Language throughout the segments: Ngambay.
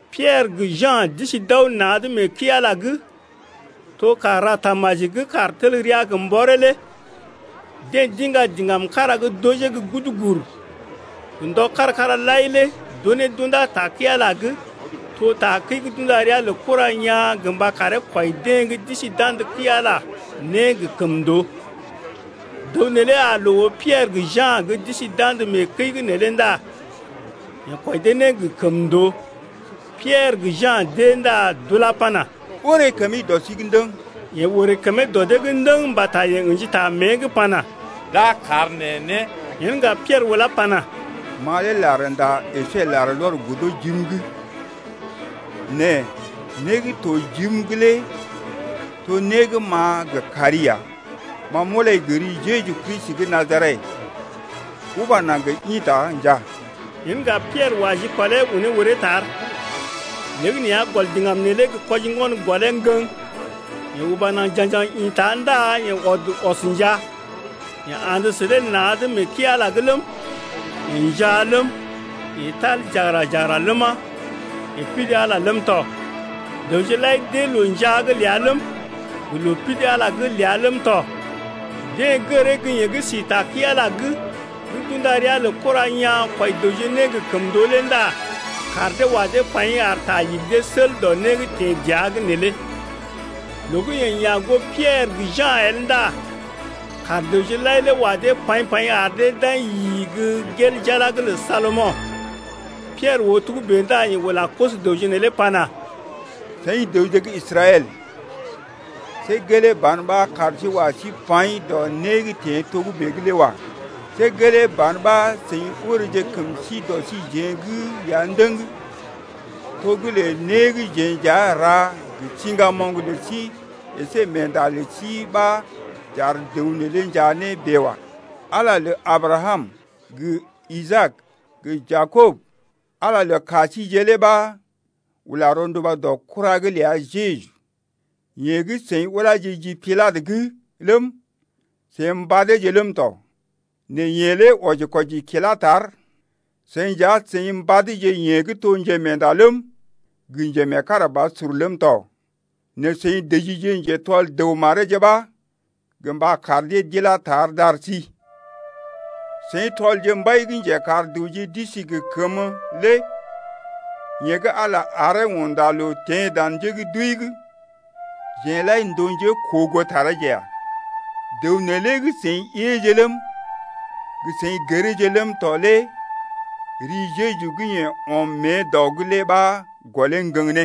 Piɛrə gə Ja̰ d’isi d’aw na̰’d mee kəi-Ala’g, to kàr ra tamaji gə́ kàr tel rəa gə mbɔree lé. Deḛ d’iŋga diŋgam kára gə́ d’ojee gə́ gudugur. Gə ndɔje kára-kára lai lé d’unee d’undá ta kəi-Ala’g, to takəi gə́ d’unda ria lə Kura Yaa̰ gə mba karee kwɔi né deḛ gə́ d’isi d’andə kəi-Ala’g gə kəmndoo. Dəw neelé aa loo oo Piɛrə gə Ja̰ gə́ d’isi d’andə mee kəi’g neelé ndá yeḛ kwɔi dee né gə kəmndoo. Piɛrə gə Ja̰ d’ée ndá d’ula pana: Oré kəmi dɔ sí’g ndəŋ. Yeḛ orè kəmee dɔ dee’g ndəŋ mbata yeḛ ə̰ji ta mée’g pana: D’a kar neḛ né. Yen ŋga Piɛrə ulá pana: Ma lé larnda əsé larlɔr godo jim’g nɛ né gə́ to jim’g lé to né gə́ m’a gə kari ya. Ma m’ulai gə ri Jeju Kristi gə́ Najaret, uba naŋg ḭta njaa! Yen ŋga Piɛrə wa jikɔlee unee uree tar. Léegəneeya gɔl diŋgam neelé gə kwojḭgon gɔlee ŋgəŋ. Yeḛ uba naŋg ja̰gjaŋ ḭta ndá yeḛ ɔd ɔs njaa. Yeḛ andə sə dee na̰’d mee kəi-Ala’g ləm, yeḛ njaa ləm, yeḛ tal jagəra-jagəra ləma, yeḛ pidi Ala ləm tɔ. Dəwje lai d’ée loo njaa’g ləa ləm, gə loo pidi Ala’g ləa ləm tɔ. Deḛ gəree gə́ yeḛ gə́ si ta kəi-Ala’g gə́ d’unda ria lə Kura Yaa̰ kwɔi dəwje né gə kəmndoo lé ndá kaar dee wa dee paḭ ar ta igi dee sel dɔ né gə́ teḛ dəa’g neelé. Loo gə́ yeḛ ya̰ goo Piɛrə gə Ja̰ el ndá kaar dəwje lai lé wa dee paḭ-paḭ ar dee d’aḭ yi-i-i gə́ gel jala’g lə Salomo̰. Piɛrə oo togə́bè ndá yeḛ ula koso-dəwje neelé pana: Seḭ dəwje gə́ Israɛl, see gelee ban ɓa kaar sí wa sí paḭ dɔ né gə́ teḛ togə́bè’g lé wa. See gelee ban ɓa seḭ oreeje kəm sí dɔ síjeḛ’g ya ndəŋ, to gə́ lə ne gə́ jeḛ nja n’ra gə siŋgamoŋ lə sí əsé meenda lə sí ɓa j’ar dəw neelé njaa ne bèe wa. Ala lə Abrakam gə Isaak gə Jakob, Ala lə ka síjeḛ lé ɓa ula rɔnduba dɔ kura’g ləa Jeju, yeḛ gə́ seḭ uláje ji Pilatə’g ləm, seḭ mbadeeje ləm tɔ nɛ yeḛ lé wɔji-kwɔji kilá tar. Seḭ nja seḭ mbadje yeḛ gə́ to Njemeenda ləm, gə Njemeekarabasur ləm tɔ nɛ seḭ dəjije njetɔl dəw mareeje ɓa gə mba kar dee d’ilá tar d’ar sí. Seḭ tɔlje Mbai gə́ njekar dəwje d’isi gə kəmə lé yeḛ gə́ Ala aree unda loo teḛ dan njé gə́ d’wəi’g, jeḛ lai n’toje njékoogootareeje ya. Dəw neelé gə́ seḭ éeje ləm, gə seḭ gəreeje ləm tɔ lé ri Jeju gə́ yeḛ ɔm mée dɔ’g lé ɓa gɔlee ŋgəŋ ne,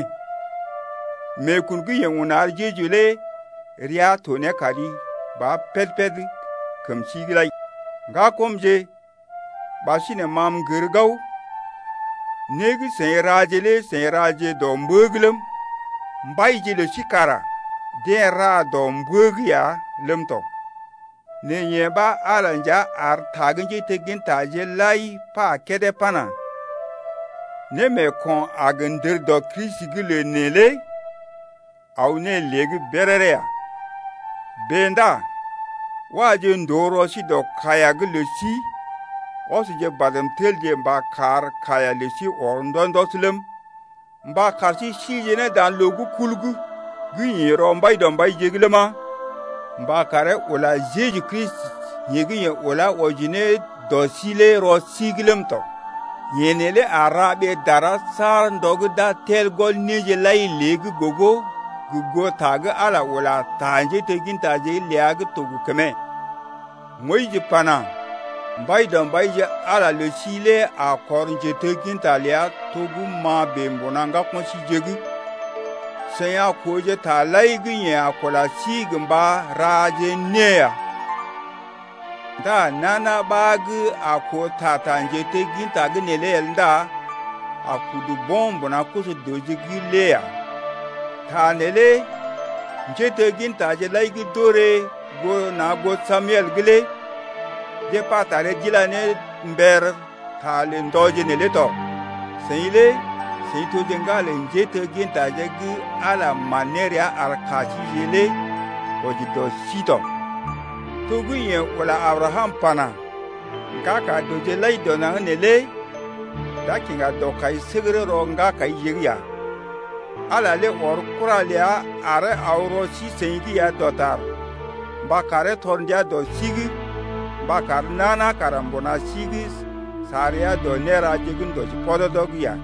meekun gə́ yeḛ un ar Jeju lé rəa to ne kari ba péd-péd kəm sí’g lai. Ŋgakɔmje, ɓasinè ma m’gər gao, né gə́ seḭ raje lé seḭ raje dɔ mbə’g ləm, mbaije lə sí kara deḛ ra dɔ mbə’g ya ləm tɔ. Nɛ yee ɓa Ala nja ar ta gə́ njéteggintaje lai pa kédé pana: Némeeko̰ a gə ndər dɔ Kristi’g lə neḛ lé aw ne lée’g béréré ya. Bèe ndá waje ndòo rɔ sí dɔ kaiya’g lə sí ɔsje badm telje mba kar kaiya lə sí ɔr ndɔs-ndɔs ləm, mba kar sí sije ne dan loo gə́ kul’g gə́ ḭ rɔ Mbaidɔmbaije’g ləma, mba karee ula Jeju Kristi yeḛ gə́ yeḛ ulá wɔji ne dɔ sí lé rɔ sí’g ləm tɔ. Yeḛ neelé a ra ɓee dara saar ndɔ gə́ d’a tel gɔl néje lai lée’g gogo gə goo ta gə́ Ala ula ta njéteggintaje’g ləa gə́ to gə kəmee lé. Moyis pana: Mbaidɔmbaije Ala lə sí lé a kɔr njetegginta ləa to gə́ ma bèe mbuna ŋgako̰ síje’g. Seḭ a kooje taje lai gə́ yeḛ a kula sí gə mba raje née ya. Ndá nana ɓa gə́ a koo ta ta njetegginta’g neelé el ndá d’a kɔree mbuna koso-dəwje’g lé ya. Ta neelé njéteggintaje lai gə́ d’orè na̰ goo Samel’g lé deḛ pa taree d’ila ne mber ta lə ndɔje neelé tɔ. Seḭ lé seḭ toje ŋgalə njéteggintaje gə manrɔ gə́ Ala man ne rəa ar ka síjeḛ lé wɔji dɔ sí tɔ, to gə́ yeḛ ula Abrakam pana: Ŋgaka dəwje lai dɔ naŋg lé d’a kiŋga dɔkaisəgərə rɔ ŋgakaije’g ya. Ala ɔr kura ləa aree aw rɔ sí-seḭ’g ya dɔtar mba karee tɔr ndia dɔ sí’g mba kar nana kara mbuna sí’g sa rəa dɔ néra gə́ ndɔji pɔdɔdɔ’g ya.